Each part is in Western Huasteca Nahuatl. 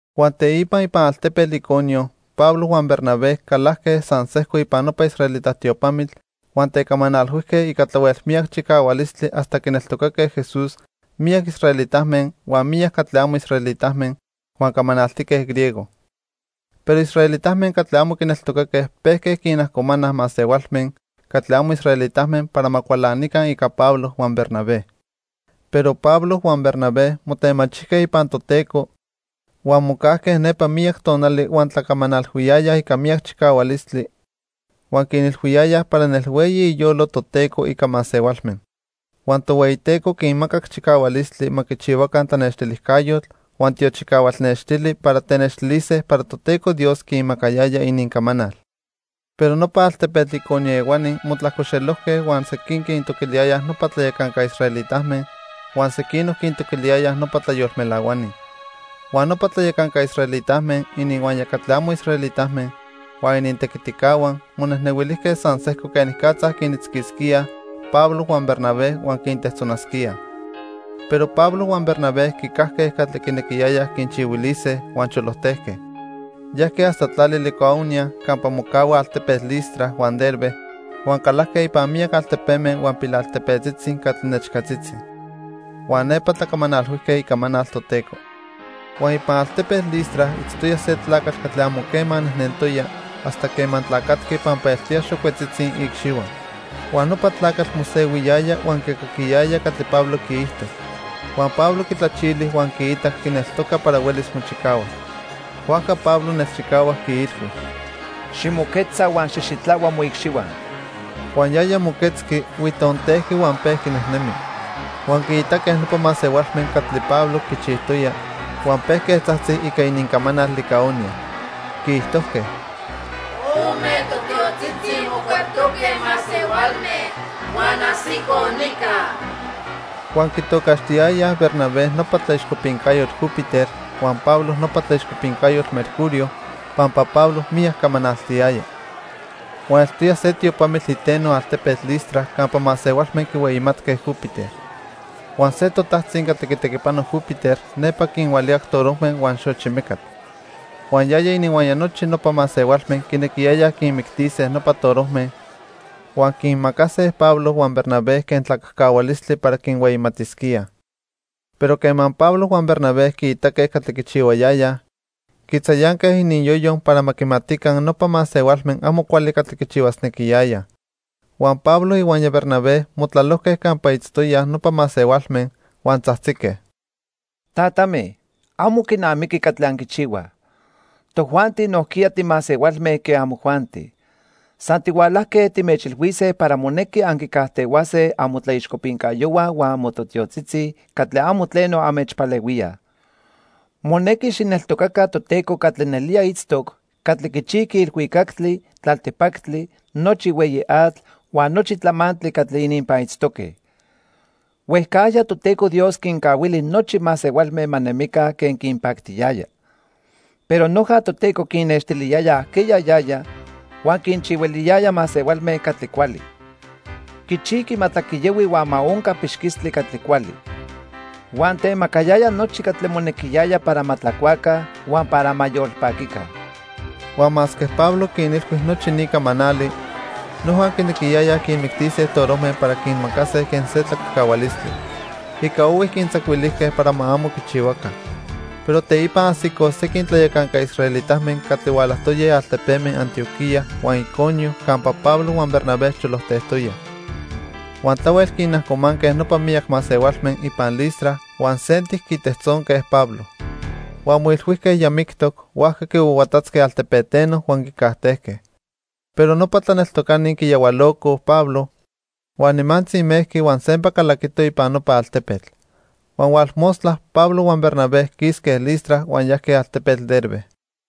Huan teipa ipan altepetl Iconio Pablo huan Bernabé calajque san sejco ipan nopa israelita tiopamitl huan tecamanalhuijque ica tlahuel miyac chicahualistli hasta quineltocaque Jesús miyac israelitame huan miyac catli amo israelitame huan camanaltique griego. Pero israelitame catli amo quineltocaque pejque quinajcomanaj masehualme catli amo israelitame para ma cualanica ica Pablo huan Bernabé. Pero Pablo huan Bernabé motemachijque ipan Toteco, huan mocajque nepa miyac tonali huan tlacamanalhuiyayaj ica miyac chicahualistli huan quinilhuiyayaj para nelhueyi iyolo Toteco ica masehualme. Huan Tohueyiteco quinmacac chicahualistli ma quichihuaca tlanextilijcayotl huan tiochicahual nextili para tenextilise para Toteco Dios quinmacayaya inincamanal. Pero nopa altepetl Iconio ehuani motlajcoxelojque huan sequin quintoquiliyayaj nopa tlayacanca israelitame, huan sequinoc quintoquiliyayaj nopa tlayolmelahuani. Huan nopa tlayacanca israelitame, ininhuaya catli amo israelitame huan inintequiticahua, monejnehuilijque san sejco quenicatza quinitzquisquíaj Pablo huan Bernabé huan quintejtzonasquíaj. Pero Pablo huan Bernabé quicajque catli quinequiyayaj quinchihuilise huan cholojtejque. Yajque hasta tlali Licaonia campa mocahuaj altepeme Listra huan Derbe huan calajque ipan miyac altepeme huan pilaltepetzitzi catli nechcatzitzi. Huan nepa tlacamanalhuijque icamanal Toteco. Huan ipan altepetl Listra itztoya se tlacatl catli amo quema nejnentoya hasta quema tlacatqui pampa eltoya xocuetzitzi iicxihua. Huan nopa tlacatl mosehuiyaya huan quicaquiyaya catli Pablo quiijto. Huan Pablo quitlachili huan quiitac quineltoca para huelis mochicahuas. Huajca Pablo nelchicahuac quiilhui: —Ximoquetza huan xijxitlahua moicxihua. Huan yaya moquetzqui, huitontejqui huan pejqui nejnemi. Huan quiitaque nopa masehualme catli Pablo quichijtoya, huan pejque tzajtzij ica inincamanal Licaonia. Quiijtojque: —Ome totiotzitzi mocueptoque masehualme huan ajsicoj nica. Huan quitocaxtiyayaj Bernabé nopa tlaixcopincayotl Júpiter huan Pablo nopa tlaixcopincayotl Mercurio, pampa Pablo miyac camanaltiyaya. Huan eltoya se tiopamitl iteno altepetl Listra campa masehualme quihueyimatque Júpiter. Huan se totajtzi catli quitequipano Júpiter nepa quinhualicac torojme huan xochi mecatl. Huan yaya ininhuaya nochi nopa masehualme quinequiyayaj quinmictise nopa torojme, huan quinmacase Pablo huan Bernabé quen tlacajcahualistli para quinhueyimatisquíaj. Pero quema Pablo huan Bernabé quiitaque catli quichihuayayaj, quitzayanque ininyoyo para ma quimatica nopa masehualme amo cuali catli quichihuasnequiyayaj. Huan Pablo ihuaya Bernabé motlalojque campa itztoyaj nopa masehualme, huan tzajtzique: —Tatame, amo quinamiqui catli anquichihuaj. Tojuanti nojquiya timasehualme quen amojuanti. San tihualajque timechilhuise para monequi anquicajtehuase amotlaixcopincayohua huan amotiotzitzi catli amo tleno anmechpalehuíaj. Monequi xijneltocaca Toteco catli nelía itztoc, catli quichijqui ilhuicactli, tlaltipactli, nochi hueyi atl, huan nochi tlamantli catli ininpan itztoque. Huejcajya Toteco Dios quincahuili nochi masehualme ma nemica quen quinpactiyaya. Pero noja Toteco quinnextiliyaya ajqueya yaya huan quinchihuiliyaya masehualme catli cuali. Quichijqui ma tlaquiyahui huan ma onca pixquistli catli cuali. Huan temacayaya nochi catli monequiyaya para ma tlacuaca huan para ma yolpaquica. Huan masque Pablo quinilhui nochi ni camanali, noja quinequiyayaj quinmictise torojme para quinmacase quen se tlacajcahualistli. Ica ohui quintzacuilijque para ma amo quichihuaca. Pero teipa ajsicoj sequin tlayacanca israelitame catli hualajtoyaj altepeme Antioquía huan Iconio campa Pablo huan Bernabé cholojtejtoyaj. Huan tlahuel quinajcomanque nopa miyac masehualme ipan Listra huan sentic quitejtzonque Pablo. Huan moilhuijque ya mictoc, huajca quihuahuatatzque altepeteno huan quicajtejque. Pero nopa tlaneltocani quiyahualocoj Pablo, huan nimantzi mejqui huan sempa calaquito ipan nopa altepetl. Huan hualmostla, Pablo huan Bernabé quisque Listra huan yajque altepetl Derbe.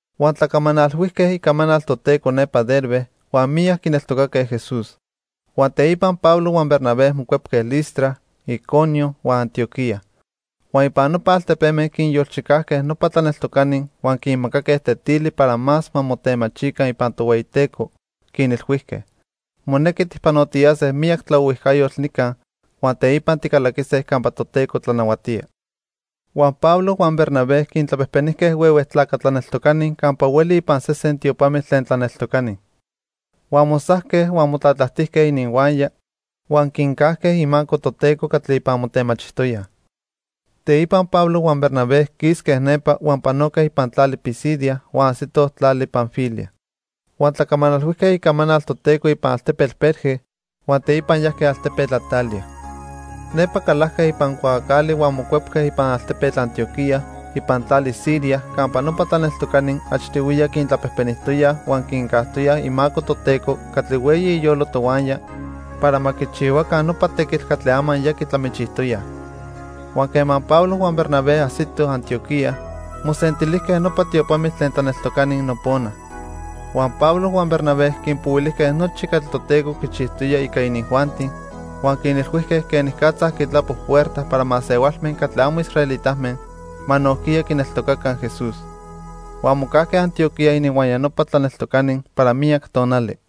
Huan tlacamanalhuijque icamanal Toteco nepa Derbe, huan miyac quineltocaque Jesús. Huan teipa Pablo huan Bernabé mocuepque Listra, Iconio, huan Antioquía. Huan ipan nopa altepeme quinyolchicajque nopa tlaneltocani huan quinmacaque tetili para más ma motemachijtinemica ipan Tohueyiteco, quinilhuijque: "Monequi tijpanotiyase miyac tlaohuijcayotl nica, huan teipa ticalaquise campa Toteco tlanahuatía." Huan Pablo huan Bernabé quintlapejpenijque huehue tlaca tlaneltocani campa hueli ipan sesen tiopamitl tlen tlaneltocani. Huan mosajque, huan motlatlajtijque ininhuaya huan quincajque imaco Toteco catli ipan motemachijtoyaj. Teipa Pablo huan Bernabé quisque nepa huan panoque ipan tlali Pisidia huan ajsitoj tlali Panfilia. Huan tlacamanalhuijque icamanal Toteco ipan altepetl Perge huan teipa yajque altepetl Atalia. Nepa calajque ipan cuaacali huan mocuepque ipan altepetl Antioquía ipan tlali Siria campa nopa tlaneltocani achtihuiya quintlapejpenijtoyaj huan quincajtoyaj imaco Toteco catli hueyi iyolo tohuaya para ma quichihuaca nopa tequitl catli ama ya quitlamichijtoyaj. Huan quema Pablo huan Bernabé ajsitoj Antioquía, mosentilijque nopa tiopamitl tlen tlaneltocani nopona. Huan Pablo huan Bernabé quinpohuilijque nochi catli Toteco quichijtoya ica inijuanti, huan quinilhuijque quenicatza quitlapo puerta para masehualme catli amo israelitame ma nojquiya quineltocaca Jesús. Huan mocajque Antioquía ininhuaya nopa tlaneltocani para miyac tonali.